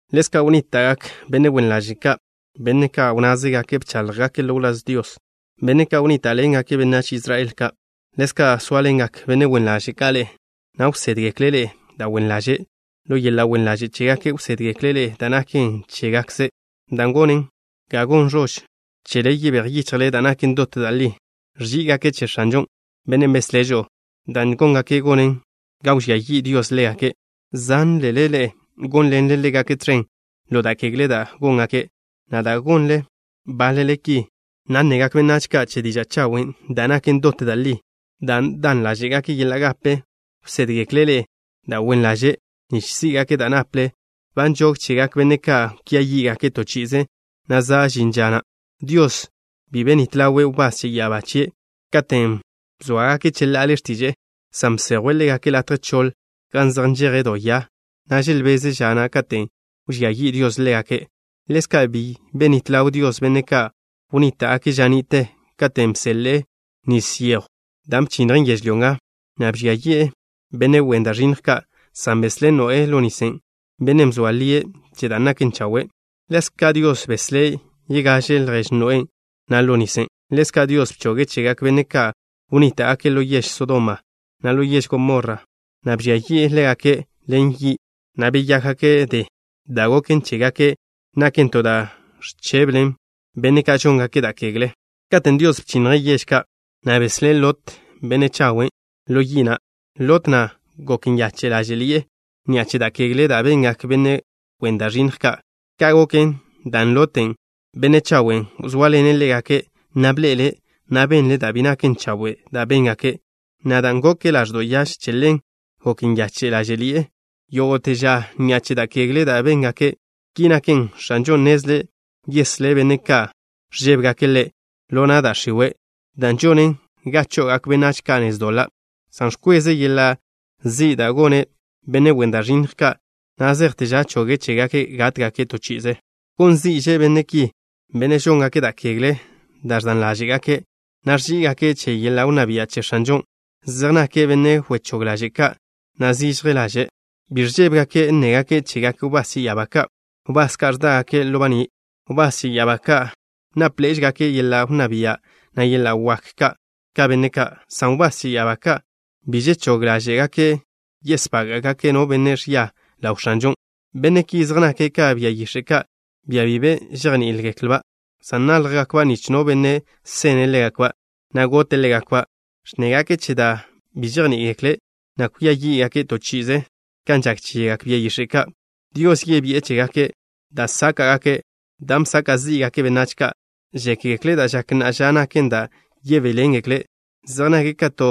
Ḻezka' wnníta'gak benne' wen ḻaže' ka', benne' ka' wnnázegake' bcháḻjgake' ḻo wláz Dios, benne' ka' wnníta'ḻengake' benách Israel ka'. Ḻezka' sóaḻengak benne' wen ḻaže' ka' ḻe'e, na' wsédgekle' ḻe'e da' wen ḻaže'. Ḻo yeḻa' wen ḻaže' chégake' wsédgekle' ḻe'e da' naken chégakze', dan' gonen ga gon ẕož chele yebéj yichjle da' naken dot da' li. Ẕží'igake' che X̱anžo, Bennen' beslé' žo'o. Dan' góngake' gonen ga wžía yi' Dios ḻégake'. Zanle ḻe'e gónḻenle ḻégake' tẕen ḻo da' kegle da' góngake', na' dan' gonle báḻele ki, na' nnegak benách ka' che diža' chawen' da' naken dot da' li. Dan' dan ḻáže'gake' yeḻa' gape, wsédgekle' ḻe'e da' wen ḻaže', nich sí'gake' da' naple. Ba nžog chegak benne' ka' kwia yí'gake' to chi'ize, na' za' žin ža na'. Dios bi benít ḻawe' wbás che ya'abá chie' ka' katen' bzóagake' cheḻa'ale x̱tiže'e, san bsejwe' ḻégake' latje choḻ, gan zej nžeje' do ya, na' želbeze' ža na' katen' wžía yi' Dios ḻégake'. Ḻezka', bi benít ḻaw Dios benne' ka' wnníta'gake' ža ni'te katen' bseḻe'e nis yejw da' bchinnjen yežlyó nga, na' bžia yi'e benne' wen da' ẕinnj ka', san beslé' Noé ḻo nisen', bennen' bzoa lie' che da' naken chawe'. Ḻezka' Dios beslé' yegaže ljež Noé na' ḻo nisen'. Ḻezka', Dios bchoge' chegak benne' ka' wnníta'gake' ḻo yež Sodoma, na' ḻo yež Gomorra, na' bžía yi'e ḻégake' ḻen yi', na' beyákgake' de. Da' goken chégake' naken to da' ẕcheblen benne' ka' žóngake' da' kegle. Katen' Dios bchinnje' yež ka', na' beslé' Lot, benne' chawen', ḻo yi' na'. Lot na' gok nyache' ḻáže'ḻi'e ni'a che da' kegle da' bengak benne' wen da' ẕinnj ka'. Ka' goken dan' Lot, benne' chawen', wzóaḻene' ḻégake', na' bḻe'ele', na' benle' da' bi naken chawe' da' béngake', na' dan' goke' ḻaẕdo' yaž, che ḻen gok nyache' ḻáže'ḻi'e yógo'te ža ni'a che da' kegle da' béngake'. Ki naken, X̱anžon' nnezle' yeslé' benne' ka' ẕžébegake' Ḻe' ḻo na' da' x̱iwe', dan' žonen ga cho'ogak benách ka' nez doḻa', san ẕkweze' yeḻa' zi' da' gone' benne' wen da' ẕinnj ka' na' zejte ža choge' chégake' gátgake' to chi'ize. Gon zi'že' benne' ki, benne' žóngake' da' kegle da' ẕdan ḻáže'gake', na' ẕží'igake' che yeḻa' wnná bia' che X̱anžon'. Zej nake' benne' wechóg ḻaže' ka', na' zižje ḻaže'. Bi ẕžébegake' nnégake' chegak wbás che ya'abá ka', wbás ka' ẕdágake' ḻo baní'. Wbás che ya'abá ka' nápḻe'ežegake' yeḻa' wnná bia', na' yeḻa' wak ka benne' ka', san wbás che ya'abá ka' bi žechóg ḻáže'gake' yesbága'gake' no benne' ẕia ḻaw X̱anžon'. Benne' ki zej nake' ka bia yix̱e' ka', bia bi be žejní'igeklba', san náljgakba' nich no benne' sene' ḻégakba', na' gote' ḻégakba'. Ẕnnégake' che da' bi žejní'igekle', na' kwia yí'gake' to chi'ize kan žak chegak bia yix̱e' ka'. Dios yebi'e chégake' da' sáka'gake', dan' bsaka' zí'gake' benách ka'. Žékgekle' da' žak na'a ža naken da' yebéḻengekle'. Zej nake' ka to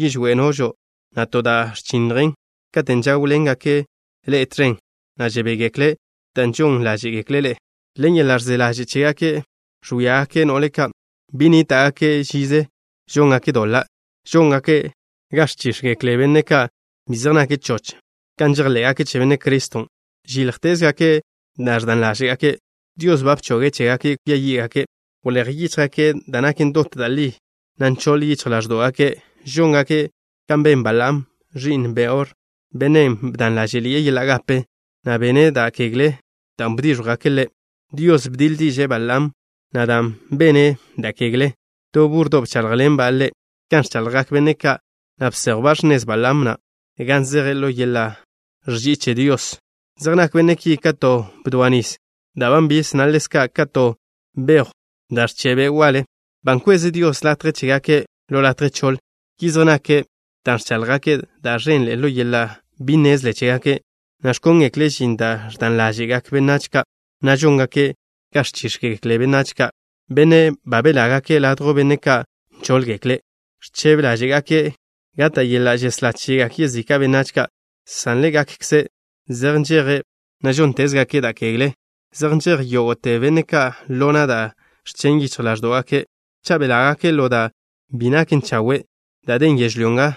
yižwé' nožo', na' to da' ẕchinnjen, katen' žáwḻengake' ḻe'e tẕen, na' žebégekle' dan' žon ḻáže'gekle' ḻe'e. Ḻen yeḻa' ẕze ḻaže' chégake' ẕwíagake' no'le ka'. Bi nníta'gake' žize žóngake' doḻa'. Žóngake' ga ẕchíx̱gekle benne' ka' bi zej nake' choch kan žejḻé'gake' che Benne' Criston'. Žíljtezgake' da' ẕdan ḻáže'gake'. Dios ba bchoge' chégake' kwia yí'gake'. Wléj yíchjgake' da' naken dot da' li, na' nchoḻ yichj ḻáẕdo'gake'. Žóngake' kan ben Balaam, ẕi'n Beor, bennen' bdan ḻážeḻi'e yeḻa' gape, na' bene' da' kegle dan' bdíẕjwgake' ḻe'. Dios bdiḻ diže'e Balaam na' dan' bene' da' kegḻen'. To búrrodo' bcháḻjḻenba' ḻe' kan ẕchaḻjgak benne' ka', na' bséjwba' x̱nez Balaam na' gan zeje' ḻo yeḻa' ẕži'i che Dios. Zej nak benne' ki ka to bdoa nis da' ba nbiž, na' ḻezka' ka to bejw da' ẕche' be' waḻe. Ba nkweze Dios latje chégake' ḻo latje choḻ. Ki zej nake' dan' ẕcháḻjgake' da' ẕenḻe'e ḻo yeḻa' bi nnezle chégake', na' ẕkóngekle' žin da' ẕdan ḻáže'gak benách ka', na' žóngake' ga ẕchíx̱gekle benne' ka', benne' ba belágake' ladjw benne' ka' nchóḻgekle'. Ẕchebe ḻáže'gake' gata' yeḻa' žeslá chegak yezika' benách ka', san ḻégakkze' zej nžeje', na' žóntezgake' da' kegle. Zej nžej yógo'te benne' ka' ḻo na' da' ẕchen' yichj ḻáẕdo'gake'. Cha' belágake' ḻo da' bi naken chawe' da' den yežlyó nga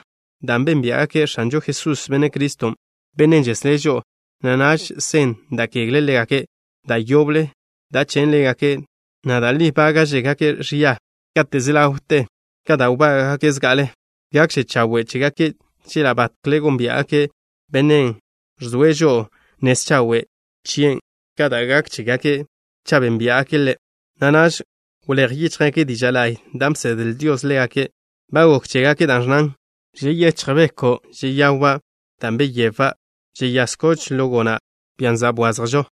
dan' bénbia'gake' X̱anžo Jesús, Benne' Criston', Bennen' žeslé' žo'o, na' naž sen da' kegle ḻégake' da' yoble, dan' chen' ḻégake', na' da' li bága'žegake' ẕia kate' se ḻawte ka da' wbága'gake' zga'ale. Gakže chawe' chégake' chela' batkle gónbia'gake' Bennen' ẕzoe' žo'o nez chawe' chien' ka da' gak chégake' cha' bénbia'gake' Ḻe', na' naž wléj yíchjgake' diža' la'y da' bsedle Dios ḻégake'. Ba gok chégake' da' ẕnnan: Žeyéchj beko', žeyawba' da' beyebba'. Žeyáz koch ḻo gona', bian' za' bwazjžo.